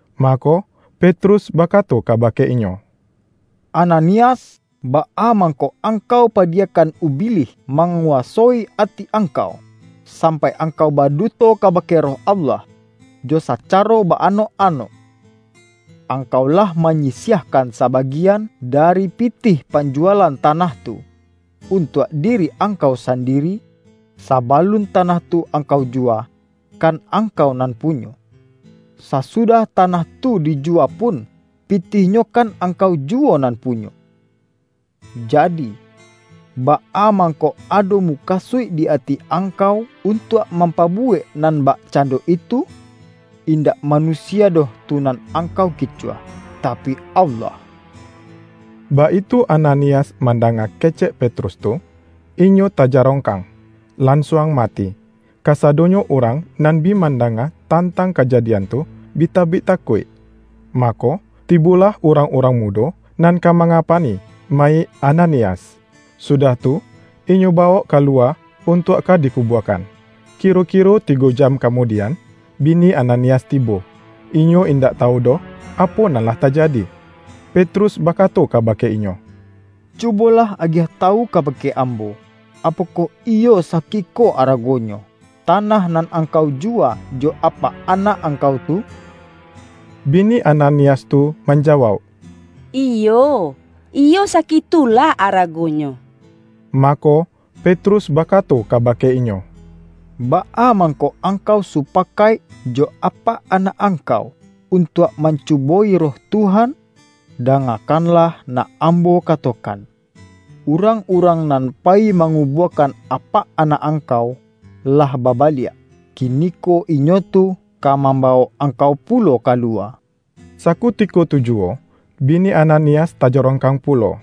Mako, Petrus bakato kabake inyo,”Ananias, baa mangko angkau padiyakan Ubilih manguwasoi ati angkau, sampai angkau baduto kabake Roh Allah, jo sacaro ba-anok-anok, angkau lah manyisiahkan sabagian dari pitih panjuwalan tanah tu, untuak diri angkau sandiri? Sabalun tanah tu angkau juwa, kan angkau nan punyo. Sasudah tanah tu dijuwa pun, pitihnyo kan angkau juwo nan punyo. Jadi, baa mangko ado mukasuik di ati angkau untuak mampabuwek nan bakcando itu? Indak manusia doh tu nan angkau kicuah, tapi Allah!” Baitu Ananias mandanga kecek Petrus tu, inyo tajarongkang, lansuang mati. Kasadonyo urang nan bi mandanga tantang kajadian tu, bi tabik takuik. Mako, tibolah urang-urang mudo nan ka mangapani mayik Ananias, sudah tu, inyo bawok kaluwa untuak ka dikubuakan. Kiro-kiro tigo jam kamudian, bini Ananias tibo. Inyo indak tawu doh, apo nan lah tajadi. Petrus bakato kabake inyo,”Cubolah agiah tawu kabake ambo: Apokoh iyo sakiko aragonyo, tanah nan angkau juwa jo apak anak angkau tu?” Bini Ananias tu manjawauk,”Iyo, iyo sakitulah aragonyo.” Mako, Petrus bakato kabake inyo,”Baa mangko angkau supakaik jo apak anak angkau, untuak mancubo-i Roh Tuhan? Dangakanlah nak ambo katokan! Urang-urang nan payi mangubuakan apak anak angkau lah babaliak. Kiniko inyo tu ka mambawok angkau pulo kaluwa.” Sakutiko tu juwo bini Ananias tajarongkang pulo,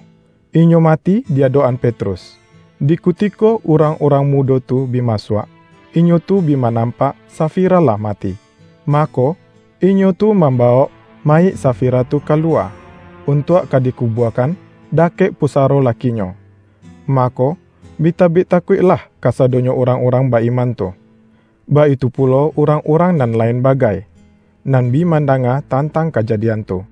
inyo mati di adok-an Petrus. Di kutiko urang-urang mudo tu bi masuak, inyo tu bi manampak Safira lah mati. Mako, inyo tu mambawok mayik Safira tu ka luwa, untuak ka dikubuakan dakek pusaro lakinyo. Mako, bi tabik takuiklah kasadonyo urang-urang ba-iman tu, baitu pulo urang-urang nan lain bagai, nan bi mandanga tantang kajadian tu.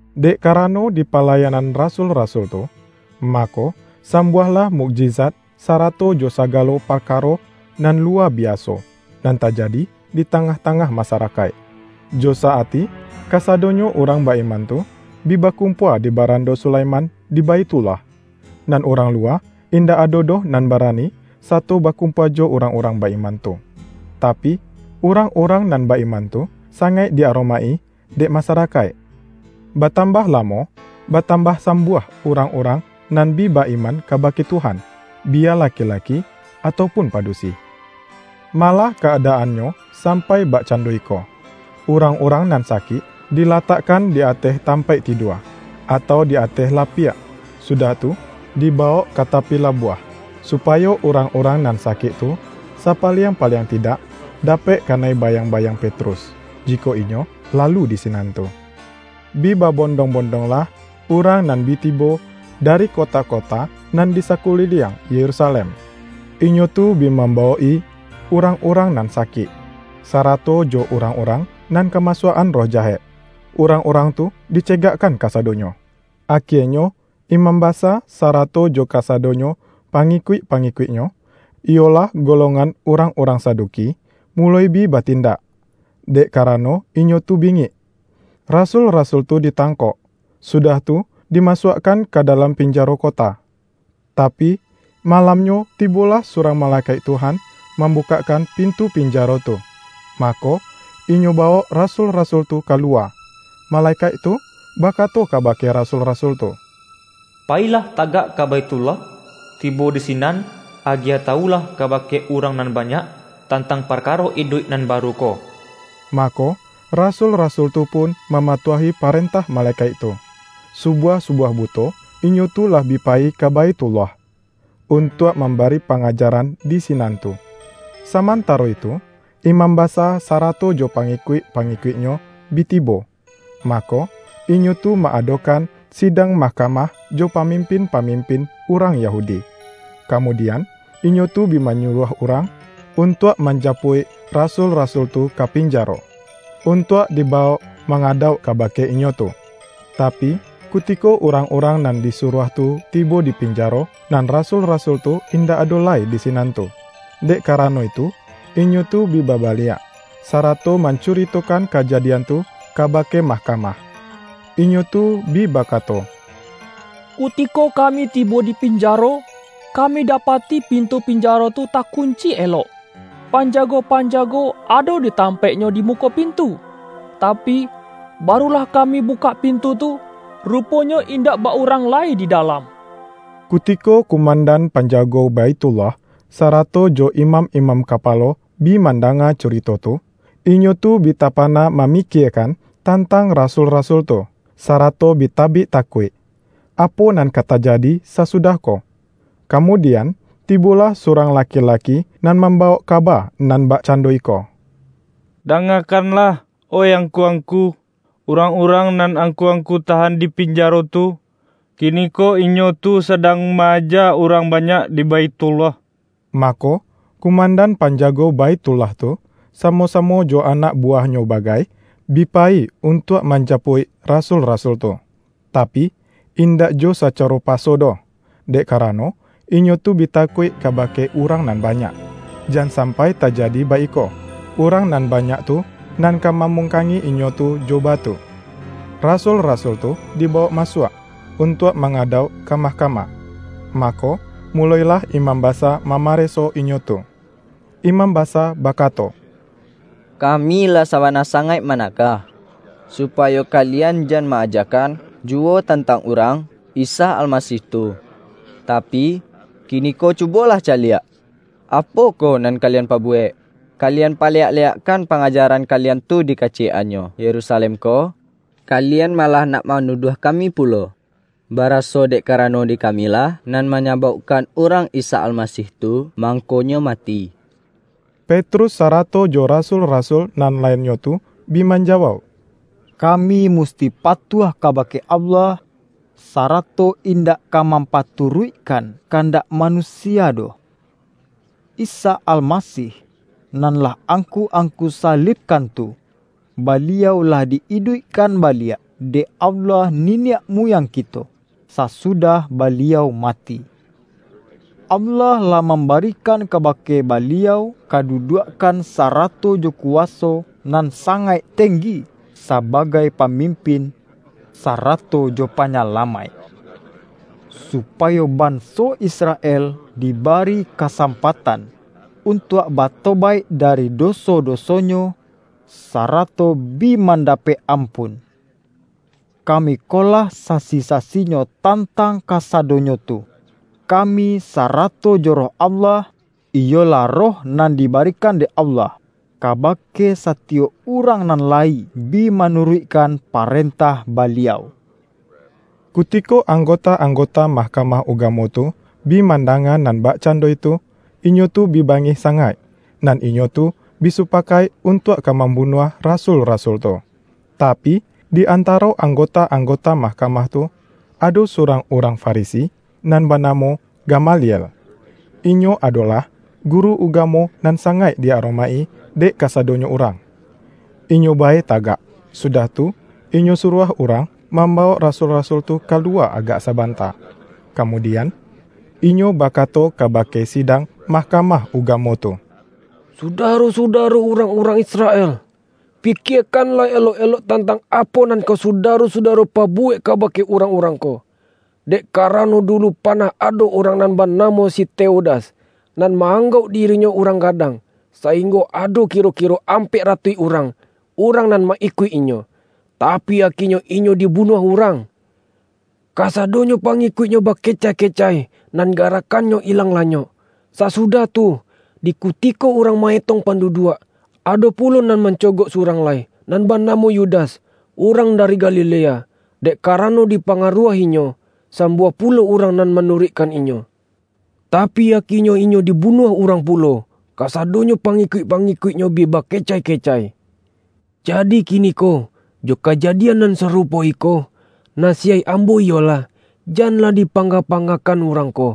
Dek karano di palayanan rasul-rasul tu, mako, sambuahlah mukjizat sarato jo sagalo parkaro nan luwa biaso, nan tajadi di tangah-tangah masarakaik. Jo sa-ati kasadonyo urang ba-iman tu, bi bakumpua di Barando Sulaiman di Baithullah. Nan urang luwa, indak ado doh nan barani sato bakumpua jo urang-urang ba-iman tu. Tapi, urang-urang nan ba-iman tu, sangaik di-aromaik-i dek masarakaik. Batambah lamo, batambah sambuah urang-urang nan bi ba-iman kabake Tuhan — biya laki-laki atau pun padusi. Malah ka-adaannyo sampai bakcando iko; urang-urang nan sakik dilatakkan di ateh tampaik tidua, atau di ateh lapiak, sudah tu, dibawok ka tapi labuah, supayo urang-urang nan sakik tu, sapaliang-paliang tidak, dapek kanai bayang-bayang Petrus, jikok inyo lalu di sinan tu. Bi babondong-bondonglah urang nan bi tibo dari kota-kota nan di sakuliliang Yerusalem. Inyo tu bi mambawok-i urang-urang nan sakik, sarato jo urang-urang nan kamasuak-an roh jahek. Urang-urang tu dicegakkan kasadonyo. Akienyo imam basa, sarato jo kasadonyo pangikuik-pangikuiknyo, iyolah golongan urang-urang Saduki, muloi bi batindak, dek karano inyo tu bingik. Rasul-rasul tu ditangkok, sudah tu dimasuakkan ka dalam pinjaro kota. Tapi, malamnyo tibolah surang malekaik Tuhan mambukakkan pintu pinjaro tu, mako, inyo bawok rasul-rasul tu ka luwa. Malekaik tu bakato kabake rasul-rasul tu, ”Payilah tagak ka Baithullah, tibo di sinan agiah tawulah kabake urang nan banyak, tantang parkaro iduik nan baru ko.” Mako, rasul-rasul tu pun mamatuahi parentah malekaik tu. Subuah-subuah buto, inyo tu lah bi payi ka Baithullah, untuak mambari pangajaran di sinan tu. Samantaro itu, imam basa sarato jo pangikuik-pangikuiknyo bi tibo, mako, inyo tu ma-adokan sidang mahkamah jo pamimpin-pamimpin urang Yahudi. Kamudian, inyo tu bi manyuruah urang, untuak manjapuik rasul-rasul tu ka pinjaro, untuak dibawok mangadauk kabake inyo tu. Tapi, kutiko urang-urang nan disuruah tu tibo di pinjaro, nan rasul-rasul tu indak ado lai di sinan tu. Dek karano itu inyo tu bi babaliak, sarato mancuritokan kajadian tu kabake mahkamah. Inyo tu bi bakato,”Kutiko kami tibo di pinjaro, kami dapati pintu pinjaro tu takunci elok, panjago-panjago ado di tampaiknyo di muko pintu. Tapi, baru lah kami bukak pintu tu, ruponyo indak ba-urang lai di dalam.” Kutiko kumandan panjago Baithullah, sarato jo imam-imam kapalo bi mandanga curito tu, inyo tu bi tapana mamikiekan tantang rasul-rasul tu, sarato bi tabik takuik, apo nan ka tajadi sasudah ko. Kamudian, tibolah surang laki-laki nan mambawok kaba nan bakcando iko,”Dangakanlah oih angku-angku! Urang-urang nan angku-angku tahan di pinjaro tu, kiniko inyo tu sadang ma-aja urang banyak di Baithullah!” Mako, kumandan panjago Baithullah tu, samo-samo jo anak buwahnyo bagai, bi payi untuak manjapuik rasul-rasul tu. Tapi, indak jo sacaro paso doh, dek karano, inyo tu bi takuik kabake urang nan banyak; jan sampai tajadi baiko, urang nan banyak tu nan ka mamungkangi inyo tu jo batu. Rasul-rasul tu dibawok masuak, untuak mangadauk ka mahkamah. Mako, mulo-ilah imam basa mamareso inyo tu. Imam basa bakato,”Kami lah sabana sangaik managah, supayo kalian jan ma-ajakan juwo tantang Urang (Isa Almasih) tu. Tapi, kiniko cubolah caliak, apo ko nan kalian pabuwek! Kalian paleyak-leyakkan pangajaran kalian tu di kaciyek-annyo Yerusalem ko, kalian malah nak manuduah kami pulo, baraso dek karano di kamilah nan manyabaukkan Urang (Isa Almasih) tu mangko-Nyo mati.” Petrus sarato jo rasul-rasul nan lainnyo tu bi manjawauk,”Kami musti patuah kabake Allah, sarato indak ka mampaturuikkan kandak manusia doh. Isa Almasih, nan lah angku-angku salibkan tu, Baliau lah di-iduikkan baliak dek Allah niniak muyang kito, sasudah Baliau mati. Allah lah mambarikan kabake Baliau kaduduakkan, sarato jo kuwaso nan sangaik tenggi sabagai Pamimpin, sarato jo Panyalamaik; supayo banso Israel dibari kasampatan, untuak batobaik dari doso-dosonyo, sarato bi mandapek ampun. Kami ko lah sasi-sasinyo tantang kasadonyo tu — kami sarato jo Roh Allah, iyolah Roh nan di barikan dek Allah, kabake satiyok urang nan layi bi manuruikkan parentah Baliau.” Kutiko anggota-anggota Mah-kamah Ugamo tu, bi mandanga nan bakcando itu, inyo tu bi bangih sangaik, nan inyo tu bi supakaik untuak ka mambunuah rasul-rasul tu. Tapi, di antaro anggota-anggota mahkamah tu, ado surang urang Farisi nan banamo Gamaliel. Inyo adolah guru ugamo nan sangaik di aromaik-i dek kasadonyo urang. Inyo bae tagak, sudah tu, inyo suruah urang mambawok rasul-rasul tu ka luwa agak sabanta. Kamudian, inyo bakato kabake sidang Mahkamah Ugamo tu,”Sudaro-sudaro urang-urang Israel! Pikiekanlah elok-elok tantang apo nan ka Sudaro-sudaro pabuwek kabake urang-urang ko. Dek karano, dulu panah ado urang nan banamo si Teudas, nan ma-anggauk dirinyo urang gadang, sainggo ado kiro-kiro ampek ratuih urang, urang nan ma-ikuik inyo. Tapi, akienyo inyo dibunuah urang, kasadonyo pangikuiknyo bakecai-kecai, nan garakkannyo ilang lanyok. Sasudah itu, di kutiko urang ma-etong panduduak, ado pulo nan mancogok surang lai, nan banamo Yudas, urang dari Galilea. Dek karano dipangaruah-inyo, sambuah pulo urang nan manuruikkan inyo. Tapi, akienyo inyo dibunuah urang pulo, kasadonyo pangikuik-pangikuiknyo bi bakecai-kecai. Jadi kiniko, jo kajadian nan sarupo iko, nasiyaik ambo iyolah: janlah dipanga-pangakan urang-urang ko,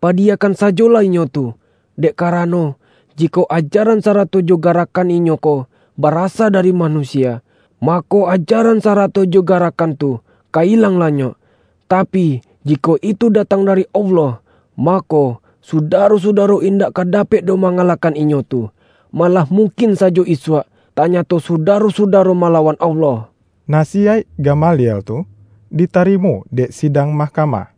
padiyakan sajolah inyo tu. Dek karano, jikok ajaran sarato jo garakkan inyo ko, barasa dari manusia, mako, ajaran sarato jo garakkan tu, ka ilang lanyok. Tapi, jikok itu datang dari Allah, mako, Sudaro-sudaro indak ka dapek doh mangalahkan inyo tu. Malah mungkin sajo isuak, tanyato Sudaro-sudaro malawan Allah.” Nasiyaik Gamaliel tu ditarimo dek sidang mahkamah.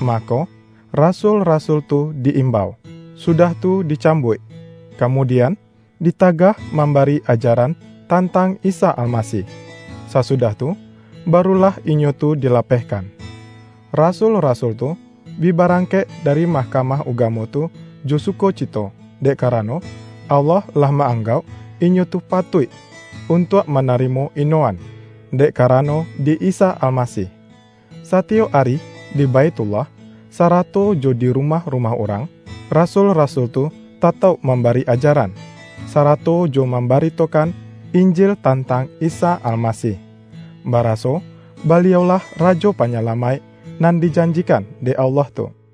Mako, rasul-rasul tu di-imbau, sudah tu dicambuik, kamudian, ditagah mambari ajaran tantang Isa Almasih. Sasudah tu, barulah inyo tu dilapehkan. Rasul-rasul tu, bi barangkek dari Mahkamah Ugamo tu jo sukocito, dek karano, Allah lah ma-anggauk inyo tu patuik untuak manarimo ino-an, dek karano di Isa Almasih. Satiyok ari di Baithullah, sarato jo di rumah-rumah urang, rasul-rasul tu tatauk mambari ajaran, sarato jo mambaritokan Injil tantang Isa Almasih, baraso Baliau-lah Rajo Panyalamaik nan dijanjikan dek Allah tu. RIWAYAIK RASUL-RASUL